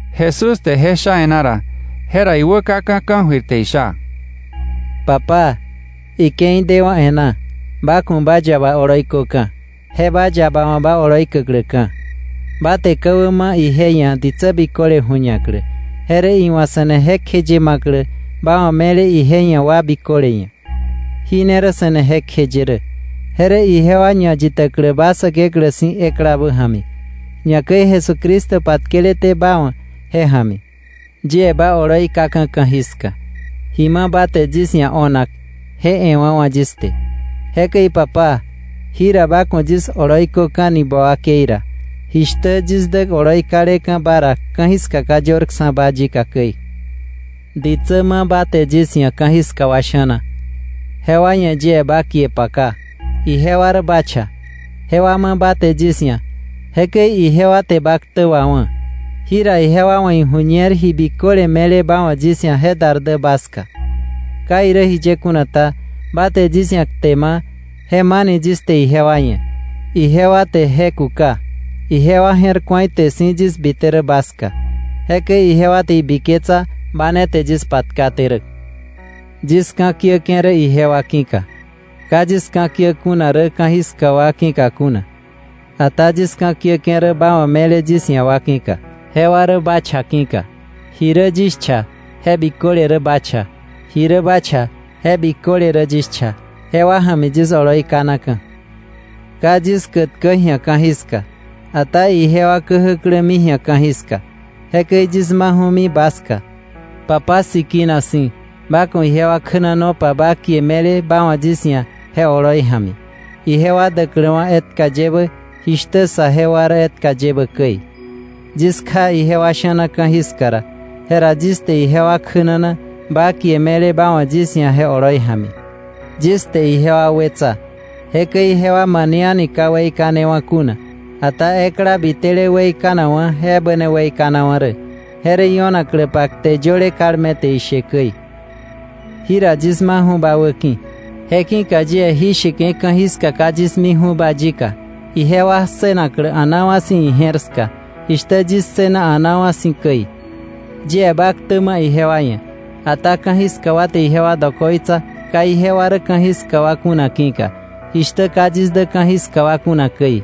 Jesús te je sha e̱ná ra, jera iwä kaka̱ ka̱jöir te isha: “Papá, ike̱i dewa̱ e̱ná. Ba ku̱ ba yaba oloi köka̱, je ba yaba wa̱ ba oloi käkläka̱. Ba te ka̱wä ma̱ ije ia̱ ditsä biköle ju̱ñaklä, je rä iwa̱ se̱ne jekjeye ma̱klä ba wa̱ me̱le ije ia̱ wa biköle ia̱. Jí ne rä se̱ne jekjeye rä, je rä ijewa ñayitäklä ba Säkeklä si̱ eklabä ja̱mi, ñakäi Jesucristo patkeleté ba wa̱ je ja̱mi. “Yie ba oloi kaka̱ ka̱jiska. Ji ma̱ ba te yis ia̱ o̱nak je e̱wa̱wa̱ yis te. Jekäi Papá, jira ba ku̱ yis oloi köka̱ni ba wakei ra jishtä yis dä oloi kaleka̱ ba ra ka̱jiska ka yörksa̱ba yika käi. “Ditsä ma̱ ba te yis ia̱ ka̱jiska wa sha̱na, jewa ia̱ yie ba kie paka. Ijewa rä ba cha; jewa ma̱ ba te yis ia̱, jekäi ijewa te ba ktä wawá̱. Jira ijewa wa̱ iju̱ñer ji biköle me̱le ba wa̱ yis ia̱ je dar dä ba ska. Ka irä jiye kuna ta, ba te yis ia̱ kte ma̱, je ma̱ni yis te ijewa ia̱. Ijewa te je kuka, ijewa je̱r ku̱a ite si̱ yis bite rä ba ska, jekäi ijewa te ibiketsa ba ne te yis patkaté rä. “Yis ka̱kiäke̱ rä ijewa ki̱ka. Ka yis ka̱kiä kuna rä ka̱jiska wa ki̱ka kuna. Ata yis ka̱ kieke̱ rä ba wa̱ me̱le yis ia̱ wa ki̱ka, jewa rä ba cha ki̱ka. Ji rä yis cha je biköle rä ba cha, ji rä ba cha je biköle rä yis cha. Jewa ja̱mi yis oloi kanaka̱. “Ka yis kätkäk ji̱a ka̱jiska, ata ijewa käjäklämi ji̱a ka̱jiska, jekäi yis maju̱mi ba ska. Papá sikina si̱, ba ku̱ ijewa kjänanopa ba kie me̱le ba wa̱ yis ia̱ je oloi ja̱mi, ijewa däkläwa̱ etka yebä jishtä saje wa rä etka yebä käi. Yis kja ijewa sha̱na ka̱jiska ra, jera yis te ijewa kjänana ba kie me̱le ba wa̱ yis ia̱ je oloi ja̱mi. Yis te ijewa wetsa, jekäi jewa mane a̱ni ka weikanewa̱ kuna, ata ekla bitele weikanakwa̱ je ebä ne weikanawa̱ rä. Je rä io̱nakläpa kte yöle kalme te ishe käi. “Jira yis maju̱ ba wäki̱. Je ki̱ka yie jí sheke̱ ka̱jiska ka yis miju̱ba yika ijewa ssënaklä a̱naa wa̱ si̱ ije̱r ska, jishtä yis ssëna a̱naa wa̱ si̱ käi. Yie ba ktä ma̱ ijewa ia̱. Ata ka̱jiska wa te ijewa dokoitsa ka ijewa rä ka̱jiska wa kuna ki̱ka, jishtä ka yis dä ka̱jiska wa kuna käi.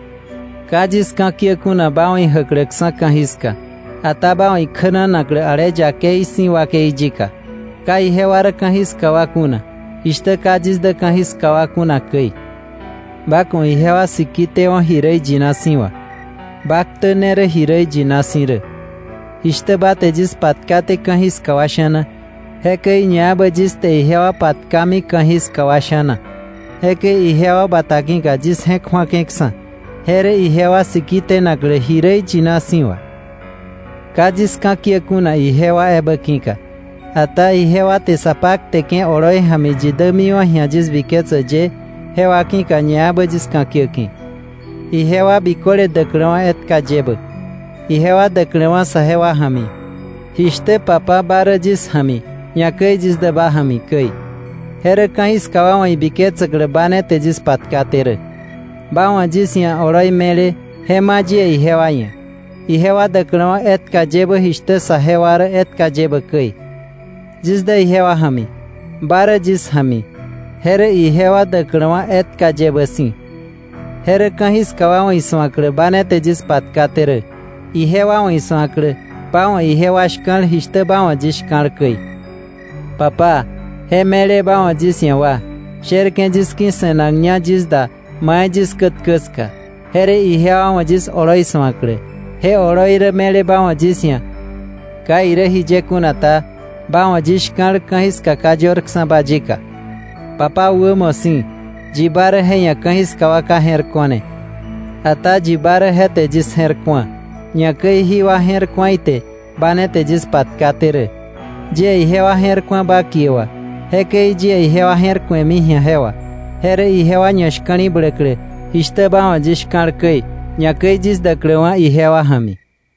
Ka yis ka̱kiä kuna ba wa̱ ijäkläksa̱ ka̱jiska, ata ba wa̱ ikjänanaklä ale yakei si̱ wakei yika. Ka ijewa rä ka̱jiska wa kuna, jishtä ka yis dä ka̱jiska wa kuna käi. Ba ku̱ ijewa siki tewo̱ ji rä iyina si̱ wà, ba ktä rä kte si̱. Jishtä ba te yis patkaté ka̱jiska wa sha̱na, jekäi ñaebä yis te ijewa patkami ka̱jiska wa sha̱na. Jekäi ijewa bata ki̱ka yis je̱k ju̱ake̱ksa̱, je rä ijewa siki tenaklä ji rä iyina si̱ wà. “Ka yis ka̱kiä kuna ijewa ebä ki̱ka, ata ijewa te sa pakteke̱ oloi ja̱mi yi dämiwa̱ ji̱a yis biketsäk ye, jewa ki̱ka ñaebä yis ka̱ kiäke̱, ijewa biköle däkläwa̱ etka yebä, ijewa däkläwa̱ saje wa ja̱mi, jishtä Papá ba rä yis ja̱mi, ñakäi yis dä ba ja̱mi käi. Je rä ka̱jiska wa wa̱ ibiketsäklä ba ne te yis patkaté rä. Ba wa̱ yis ia̱ oloi me̱le je ma̱ yie ijewa ia̱, ijewa däkläwa̱ etka yebä jishtä saje wa rä etka yebä käi. Yis dä ijewa ja̱mi, ba rä yis ja̱mi, je rä ijewa däkläwa̱ etka yebä si̱. Je rä ka̱jiska wa wa̱ isu̱aklä ba ne te yis patkaté rä, ijewa wa̱ isu̱aklä ba wa̱ ijewa shka̱l jishtä ba wa̱ yis shka̱l käi. “Papá, je me̱le ba wa̱ yis ia̱ wa, sherke̱ yis ki̱ se̱nakña yis da mai yis kätkä ska, je rä ijewa wa̱ yis oloi su̱aklä. Je oloi rä me̱le ba wa̱ yis ia̱. Ka irä jiye kuna ta, ba wa̱ yis shka̱l ka̱jiska ka yörksa̱ba yika. Papá wämo si̱, yi ba rä je ia̱ ka̱jiska wa ka je̱r ko̱ne. Ata yi ba rä je te yis je̱r ku̱a, ñakäi jí wa je̱r ku̱a ite ba ne te yis patkaté rä. Yie ijewa je̱r ku̱a ba kie wà, jekäi yie ijewa je̱r ku̱emi ji̱a je wà, je rä ijewa ñashka̱li̱bläklä, jishtä ba wa̱ yis shka̱l käi, ñakäi yis däkläwa̱ ijewa ja̱mi.”